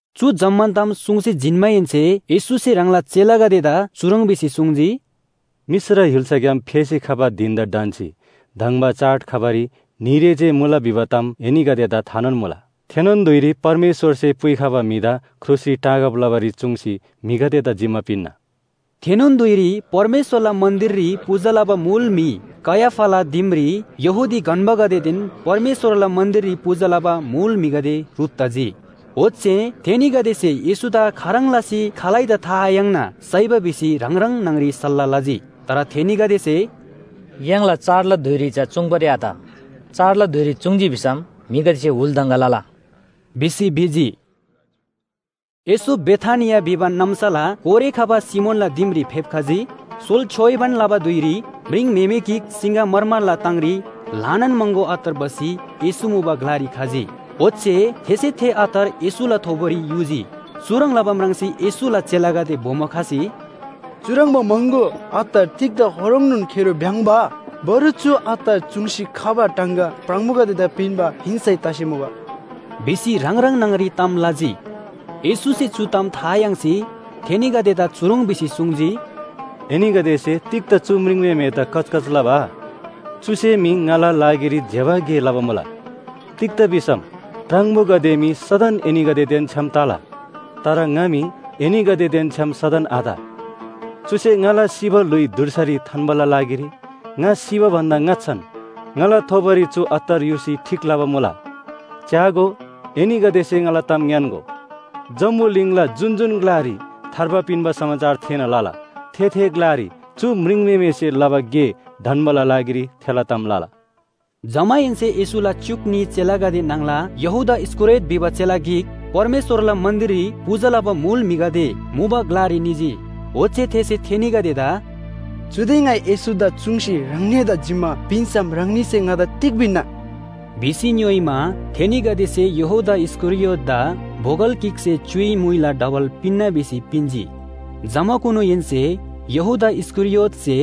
चु जम्‍मान ताम सुङ्सी जिन्‍माहेन्‍से येशूसे ह्राङला चेलागदेदा चुह्रङ् भिसी सुङ्जी, “मिश्र य्‍हुल्‍साग्‍याम फेसी खबा धिन‍दा ढन्‍सी धङ्बा चाड खबारी न्‍हीरे जे मुला भिबा ताम एनीगदेदा थानोन मुला। थेनोन धुइरी परमेश्‍वरसे पुइखबा म्‍हिदा क्रुसरी टाँगब लबारी चुङ्सी म्‍हिगदेदा जिम्‍मा पिन्‍ना।” थेनोन धुइरी परमेश्‍वरला मन्‍दिररी पूजा लबा मुल म्‍हि कैयाफाला दिमरी यहूदी गन्‍बागदेदेन परमेश्‍वरला मन्‍दिररी पूजा लबा मुल म्‍हिगदे ह्रुप तजी। ओच्‍छे थेनीगदेसे येशूदा खाह्रङ् लसी खालैदा था आयाङ्ना साइबा भिसी ह्राङ ह्राङ न्‍हङ‍री सल्‍लाह लजी। तर थेनीगदेसे “य्‍हाङला चाडला धुइरी चा चुङ्बारी आत। चाडला धुइरी चुङ्‌जी भिसम म्‍हिगदेसे हुल दङगा लला” भिसी भिजी। येशू बेथानिया भिबा नाम्‍साला कोरे खबा सिमोनला दिमरी फेप्‍खजी। सोल छ्‌योइबान लबा धुइरी म्रिङम्‍हेमे गिक सिङ्‍गमरमरला ताङरी ल्‍हानान महँगो अत्तर भसी येशू मुबा ग्‍लारी खजी। ओच्‍छे थेसे थे अत्तर येशूला थोबोरी युजी। चुह्रङ् लबा म्राङ्सी येशूला चेलागदे बोमो खसी “चुह्रङ्बा महँगो अत्तर तिग्‍दा ओह्रङ्नोन खेरो भ्‍याङ्‍बा? बरु चु अत्तर चूङ्सी खबा टाङगा प्राङबोगदेदा पिन्‍बा हिन्‍सै तसे मुबा” भिसी ह्राङ ह्राङ न्‍हङ‍री ताम लजी। येशूसे चु ताम था याङ्सी थेनीगदेदा चुह्रङ् भिसी सुङ्जी, “एनीगदेसे तिग्‍दा चु म्रिङम्‍हेमेदा कचकच लबा? चुसे मी ङाला लागिरी ज्‍यबा गे लबा मुला। तिग्‍दा भिसम प्राङबोगदे मी सदन एनीगदेदेन छ्‌याम तला। तर ङा मी एनीगदेदेन छ्‌याम सदन आत। चुसे ङाला सिबा ल्‍हुइ धुर्सारी थान्‍बाला लागिरी ङा सिबा भन्‍दा ङाच्‍छान ङाला थोबोरी चु अत्तर युसी ठीक लबा मुला। च्‍यागो, एनीगदेसे ङाला ताम ङ्‌यान्‍गो, जम्‍बुलिङला जुन जुन ग्‍लारी थार्बा पिन्‍बा समाचार थेःना लला, थे, थे ग्‍लारी चु म्रिङम्‍हेमेसे लबा गे ढन्‍बाला लागिरी थेला ताम लला।” जमाहेन्‍से येशूला च्‍युक न्‍ही चेलागदे न्‍हङला यहूदा इस्‍करियोत भिबा चेला गिक परमेश्‍वरला मन्‍दिररी पूजा लबा मुल म्‍हिगदे मुबा ग्‍लारी निजी। ओच्‍छे थेसे थेनीगदेदा “चुदे ङाइ येशूदा चुङ्सी ह्राङनीदा जिम्‍मा पिन्‍सम ह्राङनीसे ङादा तिग पिन्‍ना?” भिसी ङ्‌योइमा, थेनीगदेसे यहूदा इस्‍करियोतदा बोगल गिकसे च्‍युइ म्‍हुइला डबल पिन्‍ना भिसी पिन्‍जी। जमाकुनुहेन्‍से यहूदा इस्‍करियोतसे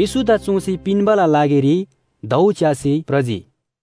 येशूदा चुङ्सी पिन्‍बाला लागिरी दाउ च्‍यासी भ्रजी।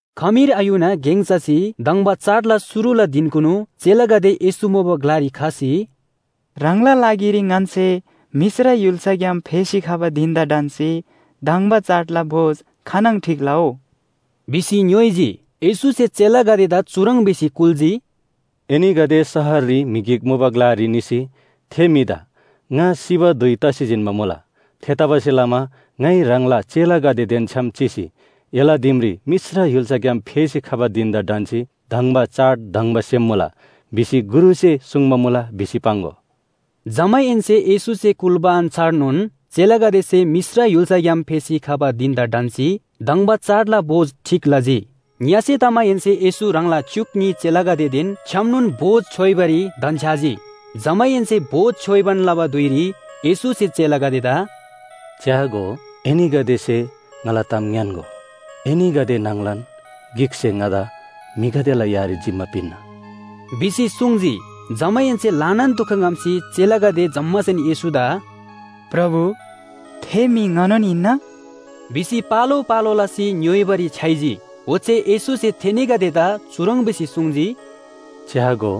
खमीर आयुना गेङ चसी धङ्बा चाडला शुरुला धिनकुनु चेलागदे येशू मुबा ग्‍लारी खसी “ह्राङला लागिरी ङन्‍से मिश्र य्‍हुल्‍साग्‍याम फेसी खबा धिन‍दा ढन्‍सी धङ्बा चाडला भोज खानङ ठीक लउ?” भिसी ङ्‌योइजी। येशूसे चेलागदेदा चुह्रङ् भिसी कुल्‍जी, “एनीगदे शहररी म्‍हि गिक मुबा ग्‍लारी निसी थे म्‍हिदा ‘ङा सिबा धुइ तसी जिन्‍बा मुला। थेतबासेलमा ङाइ ह्राङला चेलागदेदेन छ्‌याम चिसी एला दिमरी मिश्र य्‍हुल्‍साग्‍याम फेसी खबा धिन‍दा ढन्‍सी धङ्बा चाड धङ्बा सेम मुला, भिसी गुरुसे सुङ्बा मुला’ भिसी पाङ्‍गो।” जमाहेन्‍से येशूसे कुल्‍बा अन्‍छारनोन चेलागदेसे मिश्र य्‍हुल्‍साग्‍याम फेसी खबा धिन‍दा ढन्‍सी धङ्बा चाडला भोज ठीक लजी। ङ्‍यसे तमाहेन्‍से येशू ह्राङला च्‍युक न्‍ही चेलागदेदेन छ्‌यामनोन भोज छ्‌योइबारी धन्‍छ्‌याजी। जमाहेन्‍से भोज छ्‌योइबान लबा धुइरी येशूसे चेलागदेदा “च्‍यागो, एनीगदेसे ङाला ताम ङ्‌यान्‍गो, एनीगदे न्‍हङलान गिकसे ङादा म्‍हिगदेला यारी जिम्‍मा पिन्‍ना” भिसी सुङ्जी। जमाहेन्‍से ल्‍हानान दुख ङ्‍हम्‍सी चेलागदे जम्‍मासेन येशूदा “प्रभु, थे म्‍हि ङानोन हिन्‍ना?” भिसी पालो पालो लसी ङ्‌योइबारी छ्‌याइजी। ओच्‍छे येशूसे थेनीगदेदा चुह्रङ् भिसी सुङ्जी, “च्‍यागो,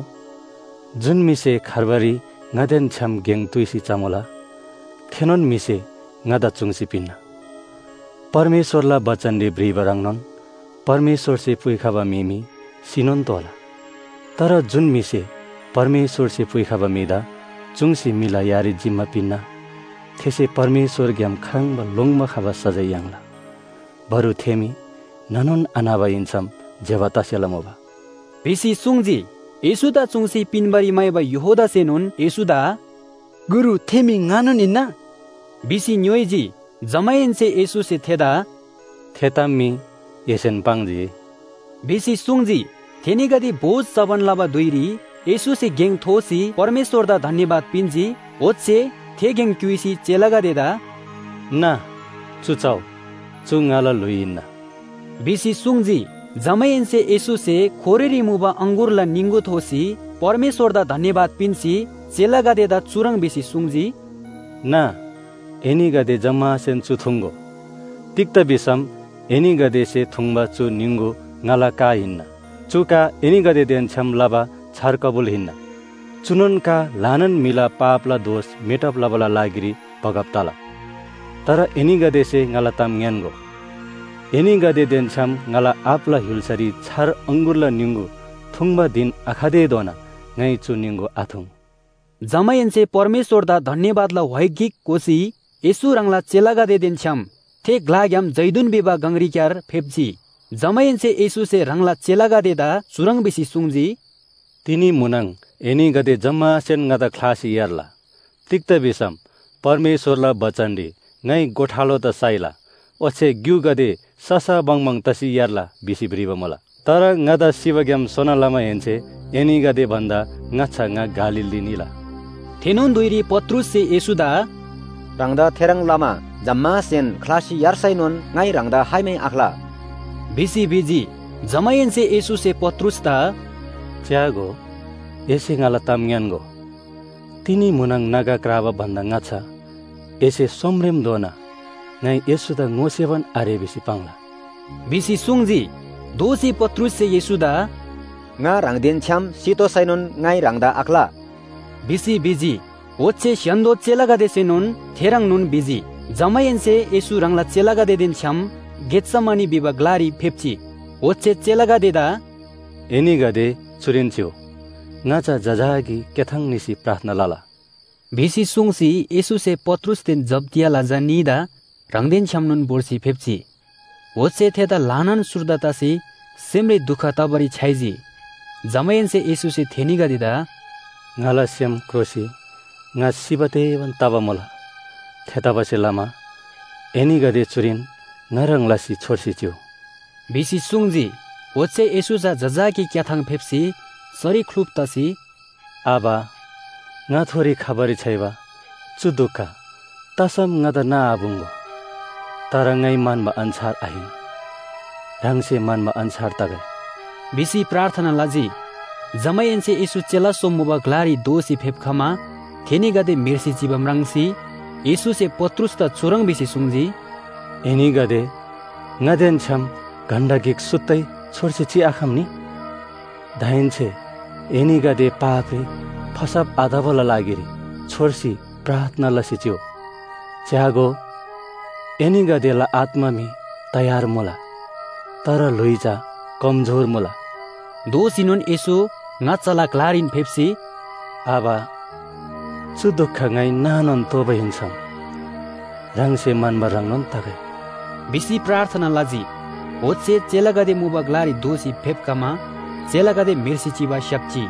जुन म्‍हिसे खार्बारी ङादेन छ्‌याम गेङ तुइसी चमुला, थेनोन म्‍हिसे ङादा चुङ्सी पिन्‍ना। परमेश्‍वरला बचनरी भ्रिबा ह्रङ्नोन परमेश्‍वरसे पुइखबा म्‍हि मी सिनोन तोःला। तर जुन म्‍हिसे परमेश्‍वरसे पुइखबा म्‍हिदा चुङ्सी म्‍हिला यारी जिम्‍मा पिन्‍ना, थेसे परमेश्‍वरग्‍याम खाह्रङ्बा लोङ्‌बा खबा सजाय याङ्ला। बरु थे मी न्‍हनोन आन्‍हबा हिन्‍सम ज्‍यबा तसेला मुबा” भिसी सुङ्जी। येशूदा चुङ्सी पिन्‍बारी म्‍हाइबा यहूदासेनोन येशूदा “गुरु, थे म्‍हि ङानोन हिन्‍ना?” भिसी ङ्‌योइजी। जमाहेन्‍से येशूसे थेदा “थे ताम मी एसेन पाङ्जी” भिसी सुङ्जी। थेनीगदे भोज चबान लबा धुइरी येशूसे गेङ थोसी परमेश्‍वरदा धन्‍यवाद पिन्‍जी। ओच्‍छे थे गेङ क्‍युइसी चेलागदेदा “ना! चु चउ, चु ङाला ल्‍हुइ हिन्‍ना” भिसी सुङ्जी। जमाहेन्‍से येशूसे खोरेरी मुबा अङगुरला निङगु थोसी परमेश्‍वरदा धन्‍यवाद पिन्‍सी, चेलागदेदा चुह्रङ् भिसी सुङ्जी, “ना! एनीगदे जम्‍मासेन चु थुङ्‍गो। तिग्‍दा भिसम एनीगदेसे थुङ्बा चु निङगु ङाला का हिन्‍ना। चु का एनीगदेदेन छ्‌याम लबा छार कबुल हिन्‍ना। चुनोन का ल्‍हानान म्‍हिला पापला दोष मेटब लबाला लागिरी बगब तला। तर एनीगदेसे ङाला ताम ङ्‌यान्‍गो, एनीगदेदेन छ्‌याम ङाला आबाला य्‍हुल्‍सारी छार अङगुरला निङगु थुङ्बा धिन आखतेधोना ङाइ चु निङगु आथुङ्।” जमाहेन्‍से परमेश्‍वरदा धन्‍यवादला व्‍हाइ गिक गोसी येशू ह्राङला चेलागदेदेन छ्‌याम थे ग्‍लाग्‍याम जैतून भिबा गङरीक्‍यार फेप्‍जी। जमाहेन्‍से येशूसे ह्राङला चेलागदेदा चुह्रङ् भिसी सुङ्जी, “तिनी म्‍हुनङ एनीगदे जम्‍मासेन ङादा ख्‍लासी यार्ला। तिग्‍दा भिसम परमेश्‍वरला बचनरी ‘ङाइ गोठालोदा साइला। ओच्‍छे ग्‍युगदे ससा बङबङ तसी यार्ला’ भिसी भ्रिबा मुला। तर ङादा सिबाग्‍याम सोना लमाहेन्‍से एनीगदे भन्‍दा ङाच्‍छा ङा गालीलरी निला।” थेनोन धुइरी पत्रुससे येशूदा “ह्राङदा थेह्रङ् लमा जम्‍मासेन ख्‍लासी यार्सैनोन ङाइ ह्राङदा खाइमै आख्‍ला” भिसी भिजी। जमाहेन्‍से येशूसे पत्रुसदा “च्‍यागो, एसे ङाला ताम ङ्‌यान्‍गो। तिनी म्‍हुनङ नागा क्राबा भन्‍दा ङाच्‍छा एसे सोमरेमधोना ‘ङाइ येशूदा ङोसेबान आरे’ भिसी पाङ्ला” भिसी सुङ्जी। दोःसी पत्रुससे येशूदा “ङा ह्राङदेन छ्‌याम सितोःसैनोन ङाइ ह्राङदा आख्‍ला” भिसी भिजी। ओच्‍छे स्‍य्‍हान्‍दो चेलागदेसेनोन थेह्रङ्नोन भिजी। जमाहेन्‍से येशू ह्राङला चेलागदेदेन छ्‌याम गेत‍समनी भिबा ग्‍लारी फेप्‍जी। ओच्‍छे चेलागदेदा “एनीगदे चुरीन चिउ, ङा चा जजाकी क्‍याथाङ निसी प्रार्थना लला” भिसी सुङ्सी येशूसे पत्रुसदेन जब्‍दियाला झा न्‍हीदा ह्राङदेन छ्‌यामनोन भोर्सी फेप्‍जी। ओच्‍छे थेदा ल्‍हानान सुर्दा तसी सेमरी दुख तबारी छ्‌याइजी। जमाहेन्‍से येशूसे थेनीगदेदा “ङाला सेम क्रोसी ङा सिबा तेबान तबा मुला। थेतबासेलमा एनीगदे चुरीन ङा ह्रङ् लसी छोर्सी चिउ” भिसी सुङ्जी। ओच्‍छे येशू चा जजाकी क्‍याथाङ फेप्‍सी सरी ख्‍लुप तसी “आबा ङाथोरी खबारी छ्‌याइबा चु दुख तसम ङादा नाआपुङ्‍गो। तर ङाइ म्‍हन्‍बा अन्‍छार आहिन, ह्राङसे म्‍हन्‍बा अन्‍छार तगै” भिसी प्रार्थना लजी। जमाहेन्‍से येशू चेला सोम मुबा ग्‍लारी दोःसी फेप्‍खमा थेनीगदे म्‍हेर्सी चिबा म्राङ्सी येशूसे पत्रुसदा चुह्रङ् भिसी सुङ्जी, “एनीगदे ङादेन छ्‌याम घण्‍टा गिक सुत्तै छोर्सी चिआखम्‍नी? दाहेन्‍से एनीगदे पापरी फसब आतबाला लागिरी छोर्सी प्रार्थना लसी चिउ। च्‍यागो, एनीगदेला आत्‍मा मी तयार मुला, तर ल्‍हुइ चा कमजोर मुला।” दोःसीनोन येशू ङाच्‍छाला ग्‍लारीन फेप्‍सी “आबा चु दुख ङाइ नानोन तोःबा हिन्‍सम ह्राङसे म्‍हन्‍बा ह्रङ्नोन तगै” भिसी प्रार्थना लजी। ओच्‍छे चेलागदे मुबा ग्‍लारी दोःसी फेप्‍खमा चेलागदे म्‍हेर्सी चिबा स्‍याप्‍जी।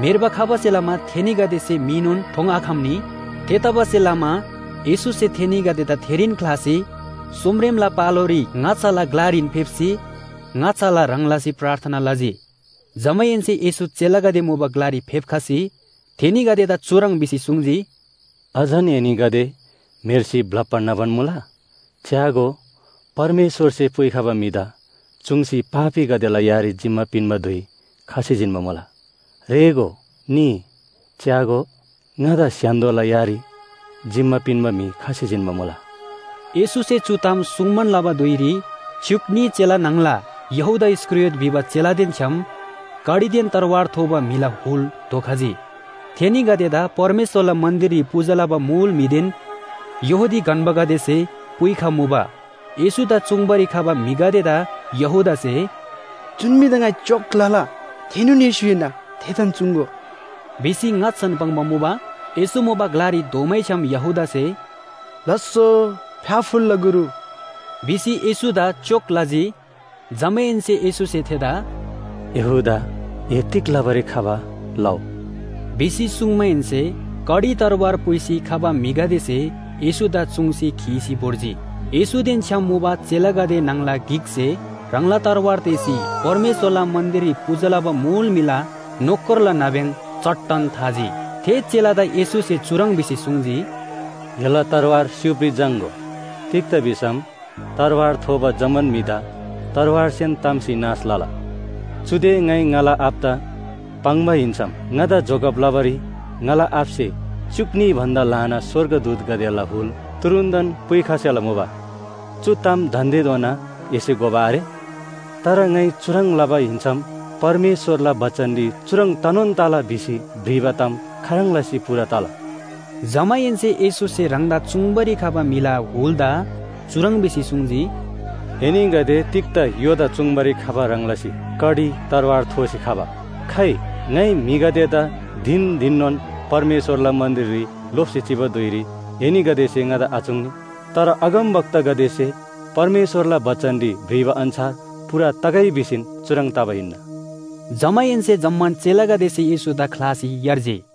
म्‍हेर्बा खबासे लमा थेनीगदेसे मीनोन ठोङ्आखम्‍नी। थेतबासेलमा येशूसे थेनीगदेदा थेरीन ख्‍लासी सोमरेमला पालोरी ङाच्‍छाला ग्‍लारीन फेप्‍सी ङाच्‍छाला ह्रङ् लसीन प्रार्थना लजी। जमाहेन्‍से येशू चेलागदे मुबा ग्‍लारी फेप्‍खसी थेनीगदेदा चुह्रङ् भिसी सुङ्जी, “अझन एनीगदे म्‍हेर्सी ब्‍लप्‍बा न्‍हबान मुला? च्‍यागो, परमेश्‍वरसे पुइखबा म्‍हिदा चुङ्सी पापीगदेला यारी जिम्‍मा पिन्‍बा धुइ खसी जिन्‍बा मुला। रेःगो, निइ! च्‍यागो, ङादा स्‍य्‍हान्‍दोला यारी जिम्‍मा पिन्‍बा म्‍हि खसी जिन्‍बा मुला।” येशूसे चु ताम सुङ्बान लबा धुइरी च्‍युक न्‍ही चेला न्‍हङला यहूदा इस्‍करियोत भिबा चेलादेन छ्‌याम कडीदेन तरवार थोबा म्‍हिला हुल धोखजी। थेनीगदेदा परमेश्‍वरला मन्‍दिररी पूजा लबा मुल म्‍हिदेन यहूदी गन्‍बागदेसे पुइखमुबा। येशूदा चुङ्बारी खबा म्‍हिगदेदा यहूदासे “जुन म्‍हिदा ङाइ च्‍योक लला थेनोन येशू हिन्‍ना, थेदान चुङ्‍गो” भिसी ङाच्‍छान पाङ्बा मुबा। येशू मुबा ग्‍लारी धोमैछ्‌याम यहूदासे “लास्‍सो, फ्‍याफुल्‍ला गुरु” भिसी येशूदा च्‍योक लजी। जमाहेन्‍से येशूसे थेदा “यहूदा, ए तिग लबारी खबा लउ” भिसी सुङ्माहेन्‍से कडी तरवार पुइसी खबा म्‍हिगदेसे येशूदा चुङ्सी खीसी भोर्जी। येशूदेन छ्‌याम मुबा चेलागदे न्‍हङला गिकसे ह्राङला तरवार तेःसी परमेश्‍वरला मन्‍दिररी पूजा लबा मुल म्‍हिला नोकरला नाब्‍यङ च्‍वाट्टन थाजी। थे चेलादा येशूसे चुह्रङ् भिसी सुङ्जी, “एला तरवार स्‍युबारी झाङ्‍गो। तिग्‍दा भिसम तरवार थोबा जम्‍मान म्‍हिदा तरवारसेन ताम्‍सी नाश लला। चुदे ङाइ ङाला आबादा पाङ्बा हिन्‍सम ङादा जोगब लबारी ङाला आबासे च्‍युक न्‍ही भन्‍दा ल्‍हानान स्‍वर्गदूतगदेला हुल तुरुन्‍तन पुइखसे मुबा। चु ताम दान्‍देधोना एसे घोबा आरे? तर ङाइ चुह्रङ् लबा हिन्‍सम परमेश्‍वरला बचनरी चुह्रङ् तनोन तला भिसी भ्रिबा ताम खाह्रङ् लसी पूरा तला?” जमाहेन्‍से येशूसे ह्राङदा चुङ्बारी खबा म्‍हिला हुलदा चुह्रङ् भिसी सुङ्जी, “एनीगदे तिग्‍दा य्‍होदा चुङ्बारी खबा ह्रङ् लसी कडी तरवार थोसी खबा? खाइ, ङाइ म्‍हिगदेदा धिन धिननोन परमेश्‍वरला मन्‍दिररी लोप्‍सी चिबा धुइरी एनीगदेसे ङादा आचुङ्नी। तर अगमवक्तागदेसे परमेश्‍वरला बचनरी भ्रिबा अन्‍छार पूरा तगै भिसीन चुह्रङ् तबा हिन्‍ना।” जमाहेन्‍से जम्‍मान चेलागदेसे येशूदा ख्‍लासी यार्जी।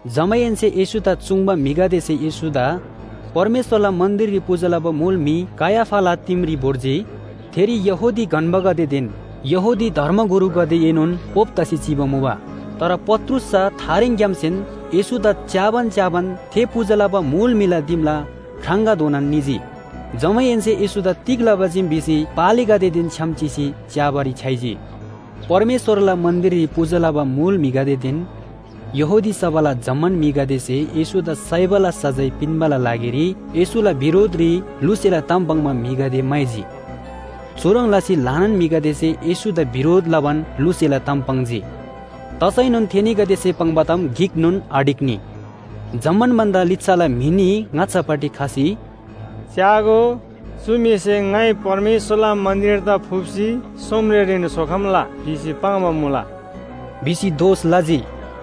जमाहेन्‍से येशूदा चुङ्बा म्‍हिगदेसे येशूदा परमेश्‍वरला मन्‍दिररी पूजा लबा मुल म्‍हि कैयाफाला दिमरी भोर्जी। थेरी यहूदी गन्‍बागदेदेन यहूदी धर्मगुरुगदेएनोन पोप तसी चिबा मुबा। तर पत्रुस चा थारेङग्‍यामसेन येशूदा च्‍याबान च्‍याबान थे पूजा लबा मुल म्‍हिला दिमला ख्राङगाधोनान निजी। जमाहेन्‍से येशूदा तिग लबा चीम भिसी पालेगदेदेन छ्‌याम चिसी च्‍याबारी छ्‌याइजी। परमेश्‍वरला मन्‍दिररी पूजा लबा मुल म्‍हिगदेदेन यहूदी सभाला जम्‍मान म्‍हिगदेसे येशूदा साइबाला सजाय पिन्‍बाला लागिरी येशूला बिरोधरी लुसीला ताम पाङ्बा म्‍हिगदे म्‍हाइजी। चुह्रङ् लसी ल्‍हानान म्‍हिगदेसे येशूदा बिरोध लबान लुसीला ताम पाङ्जी। तसैनोन थेनीगदेसे पाङ्बा ताम गिकनोन आढिक्‍नी। जम्‍मान भन्‍दा लिच्‍छाला म्‍हि न्‍ही ङाच्‍छापट्टि खसी, “च्‍यागो, चु म्‍हिसे ‘ङाइ परमेश्‍वरला मन्‍दिरदा फुप्‍सी सोमरेरीन स्‍होखम्‍ला’ भिसी पाङ्बा मुला” भिसी दोष लजी।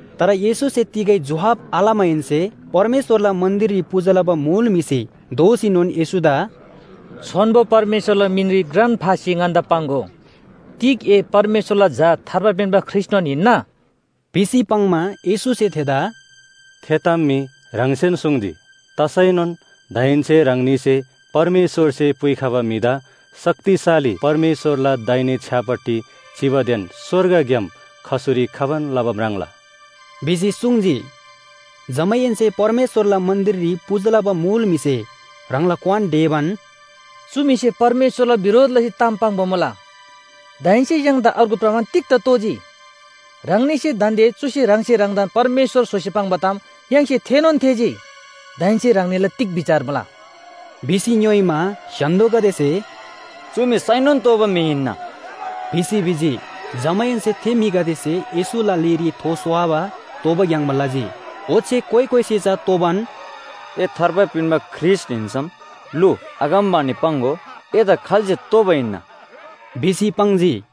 तर येशूसे तिगै जोहाब आलमाहेन्‍से परमेश्‍वरला मन्‍दिररी पूजा लबा मुल म्‍हिसे दोःसीनोन येशूदा “छोन्‍बो परमेश्‍वरला मिनरी घ्रान फासी ङन्‍दा पाङ्‍गो। तिग ए परमेश्‍वरला झा थार्बा पिन्‍बा ख्रीष्‍टनोन हिन्‍ना?” भिसी पाङ्‌मा, येशूसे थेदा “थे ताम मी ह्राङसेन सुङ्जी। तसैनोन दाहेन्‍से ह्राङनीसे परमेश्‍वरसे पुइखबा म्‍हिदा शक्तिशाली परमेश्‍वरला दाहिने छ्‌यापट्टि चिबादेन स्‍वर्गग्‍याम खसुरी खबान लबा म्राङ्ला” भिसी सुङ्जी। जमाहेन्‍से परमेश्‍वरला मन्‍दिररी पूजा लबा मुल म्‍हिसे ह्राङला क्‍वान ढेबान, “चु म्‍हिसे परमेश्‍वरला बिरोध लसी ताम पाङ्बा मुला। दाहेन्‍से य्‍हाङदा अर्गु प्रमाण तिग्‍दा तोःजी? ह्राङनीसे दान्‍दे चुसे ह्राङसे ह्राङदान परमेश्‍वर स्‍होसी पाङ्बा ताम य्‍हाङसे थेःनोन थेःजी। दाहेन्‍से ह्राङनीला तिग बिचार मुला?” भिसी ङ्‌योइमा, स्‍य्‍हान्‍दोगदेसे “चु म्‍हि साइनोन तोःबा म्‍हि हिन्‍ना” भिसी भिजी। जमाहेन्‍से थे म्‍हिगदेसे येशूला लीरी थो स्‍वाबा तोबा ग्‍याङ्‍बा लजी। ओच्‍छे कोइ कोइसे चा तोबान, “ए थार्बा पिन्‍बा ख्रीष्‍ट हिन्‍सम, लु, अगमवाणी पाङ्‍गो। एदा खाल्‍से तोबा हिन्‍ना?” भिसी पाङ्जी।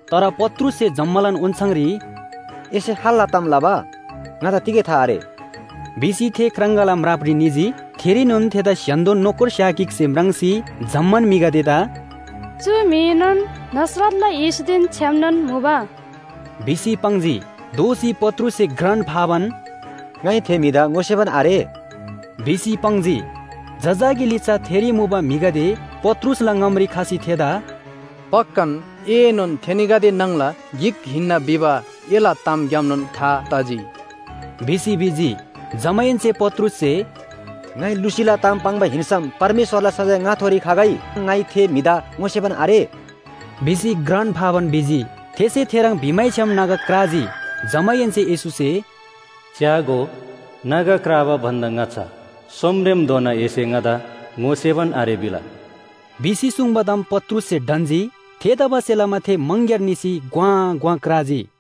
तर पत्रुससे जम्‍मालान ओन्‍छाङरी “एसे खाल्‍ला ताम लबा, ङादा तिगै था आरे” भिसी, थे ख्राङगाला म्रापरी निजी। थेरीनोन थेदा स्‍य्‍हान्‍दो नोकरस्‍या गिकसे म्राङ्सी जम्‍मान म्‍हिगदेदा “चु म्‍हिएनोन नासरतला येशूदेन छ्‌यामनोन मुबा” भिसी पाङ्जी। दोःसी पत्रुससे घ्रान फाबान, “ङाइ थे म्‍हिदा ङोसेबान आरे” भिसी पाङ्जी। जजाकी लिच्‍छा थेरी मुबा म्‍हिगदे पत्रुसला ङामरी खसी थेदा “पक्‍कान एएनोन थेनीगदे न्‍हङला गिक हिन्‍ना भिबा एला तामग्‍यामनोन था तजी” भिसी भिजी। जमाहेन्‍से पत्रुससे “ङाइ लुसीला ताम पाङ्बा हिन्‍सम परमेश्‍वरला सजाय ङाथोरी खगै भिसी घ्रान फाबान ङाइ थे म्‍हिदा ङोसेबान आरे” भिसी भिजी। थेसे थेह्रङ् भिमैछ्‍याम नागा क्राजी। जमाहेन्‍से येशूसे “च्‍यागो, नागा क्राबा भन्‍दा ङाच्‍छा सोमरेमधोना एसे ङादा ङोसेबान आरे भिला” भिसी सुङ्बा ताम पत्रुससे ढन्‍जी। थेतबासेलमा थे मङग्‍यार निसी घ्‍वाँ घ्‍वाँ क्राजी।